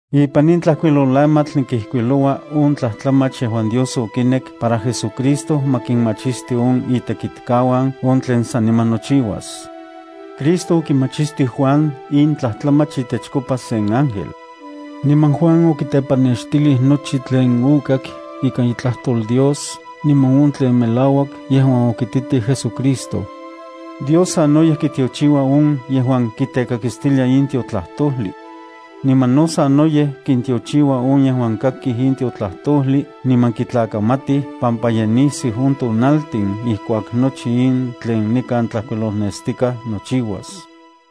Ipan in tlajkuilolamatl nikijkuiloua on tlajtlamach yejuan Dios okinek para JesuCristo ma kinmachisti on itekitkauan on tlen saniman nochiuas. Cristo okimachistij Juan in tlajtlamach itechkopa sen ángel. Niman Juan okitepannextilij nochi tlen okak ikan itlajtol Dios niman on tlen melauak yejuan okititij JesuCristo. Dios sanoyej kitiochiua on yejuan kitekakistilia in tiotlajtojli. Niman no sanoyej kintiochiua on yejuan kakij in tiotlajtojli niman kitlakamatij pampa ye nisiu on tonaltin ijkuak nochi in tlen nikan tlajkuilolnestikaj nochiuas.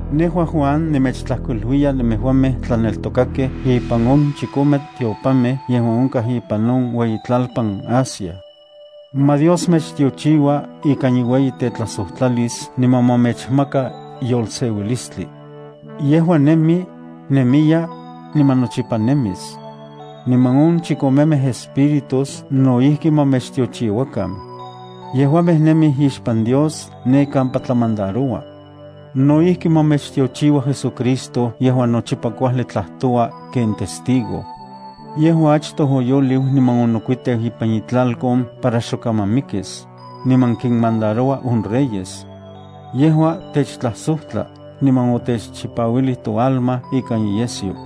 Nejua, Juan, nemechtlajkuiluiya nemejuamej tlaneltokakej ipan on chikomej tiopanmej yejuan onkaj ipan on ueyitlalpan Asia. Ma Dios mechtiochiua ikan iueyitetlajsojtlalis niman ma mechmaka yolseuilistli. Yejua nemi, nemiya, niman nochipa nemis. Niman on chikomemej espíritus no ijki ma mechtiochiuakan. Yejuamej nemij ixpan Dios ne kampa tlamandaroua. No ijki, ma mechtiochiua JesuCristo yejuan nochipa kuajli tlajtoua ken testigo. Yejua achtoj oyoliu niman onokuiteu ipan itlalkon para xok kaman mikis, niman kinmandaroua on reyes. Yejua techtlajsojtla niman otechchipauilij toalma ikan iyesyo.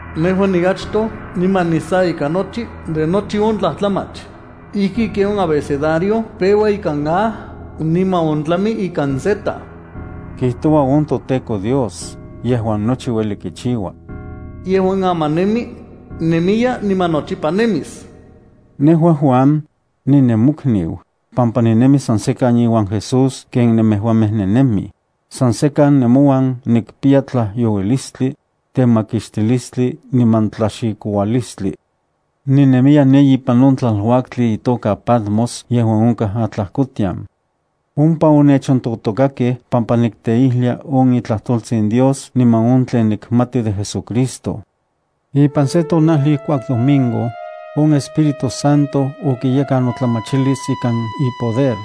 “Nejua niachtoj niman nisa ika nochi de nochi on tlajtlamach, ijki ken on abecedario peua ikan A niman ontlami ikan Z”, kijtoua on toTEKO Dios yejuan nochi ueli kichiua. Yejua aman nemi, nemiya, niman nochipa nemis. Nejua, Juan, ninemokniu. Pampa ninemi san sekan iuan Jesús ken nemejuamej nennemij, san sekan nemouan nikpiya tlajyouilistli, temakixtilistli niman tlaxikoualistli. Ninemiya ne ipan on tlaluaktli itoka Patmos yejuan onkaj atlajkotian. Ompa onechontotokakej pampa nikteijlia on itlajtoltsin Dios niman on tlen nikmati de JesuCristo. Ipan se tonajli ijkuak domingo, on Espíritu Santo okiyekan notlamachilis ikan ipoder,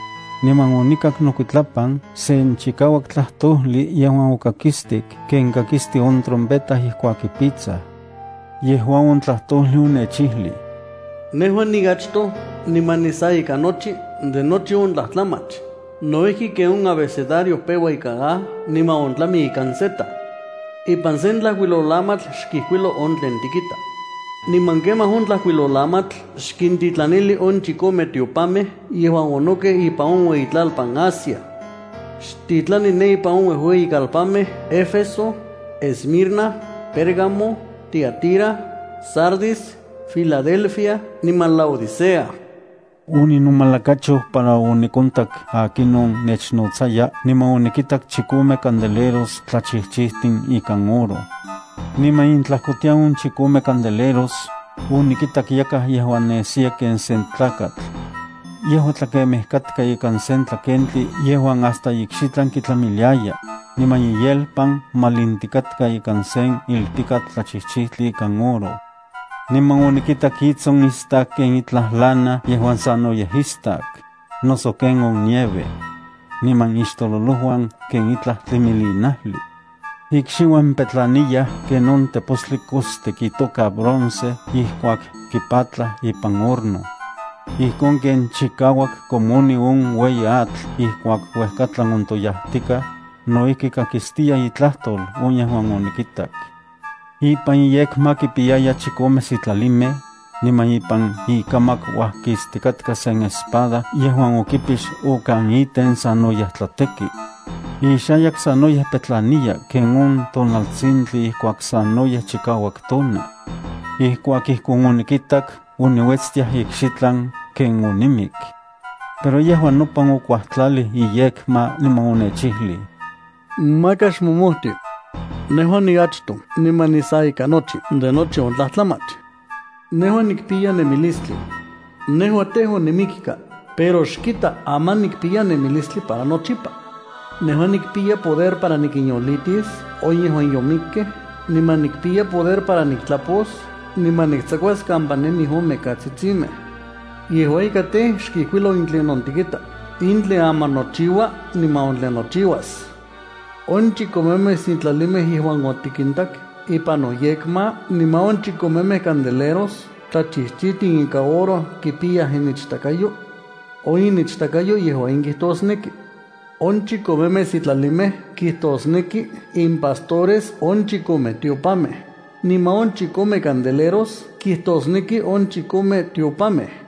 niman onikak nokuitlapan sen chikauak tlajtojli yejuan okakistik ken kakisti on trompeta ijkuak kipitsaj. Yejua on tlajtojli onechijlij: —Nejua niachtoj niman nisa ika nochi de nochi on tlajtlamach, no ijki ken on abecedario peua ikan A niman ontlami ikan Z. Ipan sen tlajkuilolamatl xkijkuilo on tlen tikita. Niman kemaj on tlajkuilolamatl xkintitlanili on chikome tiopanmej yejuan onokej ipan on ueyitlalpan Asia. Xtitlani ne ipan on uejueyikalpanmej Éfeso, Esmirna, Pérgamo, Tiatira, Sardis, Filadelfia niman Laodicea. Oninomalakacho para onikontak akinon nechnotsaya niman onikitak chikome candeleros tlachijchijtin ikan oro. Niman intlajkotian on chikome candeleros, onikitak yakaj yejuan nesiya ken sen tlakatl. Yejua tlakemej katka ikan sen tlakentli yejuan hasta ikxitlan kitlamiliaya, niman iyelpan malintikatka ikan sen ilpikatl tlachijchijtli ikan oro. Niman onikitak itson istak ken itlaj lana yejuan sanoyej istak, noso ken on nieve. Niman ixtololojuan ken itlaj tlimilinajli. Ikxiuan petlaniyaj ken on tepostli kostik itoka bronce ijkuak kipatlaj ipan horno. Ijkon ken chikauak komoni on ueyi atl ijkuak uejkatlan ontoyajtikaj, no ijki kakistiya itlajtol on yejuan onikitak. Ipan iyekma kipiyaya chikome sitlalimej, niman ipan ikamak uajkistikatka sen espada yejuan okipix okan iten sanoyej tlateki. Ixayak sanoyej petlaniya ken on tonaltsintli ijkuak sanoyej chikauak tona. Ijkuak ijkon onikitak oniuetstiaj ikxitlan ken onimik. Pero yejua nopan okuajtlalij iyekma niman onechijlij: —Maka xmomojti. Nejua niachtoj niman nisa ika nochi de nochi on tlajtlamach. Nejua nikpiya nemilistli. Nejua tej, onimikka, pero xkita, aman nikpiya nemilistli para nochipa. Nejua nikpiya poder para nikinyolitis on yejuan yomikkej niman nikpiya poder para niktlapos niman niktsakuas kampa nemij on mikatsitsimej. Yejua ika tej, xkijkuilo in tlinon tikita, in tlen aman nochiua niman on tlen nochiuas. On chikomemej sitlalimej yejuan otikintak ipan noyekma niman on chikomemej candeleros tlachijchijtin ikan oro kipiyaj inichtakayo. On inichtakayo yejua in kijtosneki: on chikomemej sitlalimej kitosneki impastores on chikome tiopanmej, niman on chikome candeleros kijtosneki on chikome tiopanmej.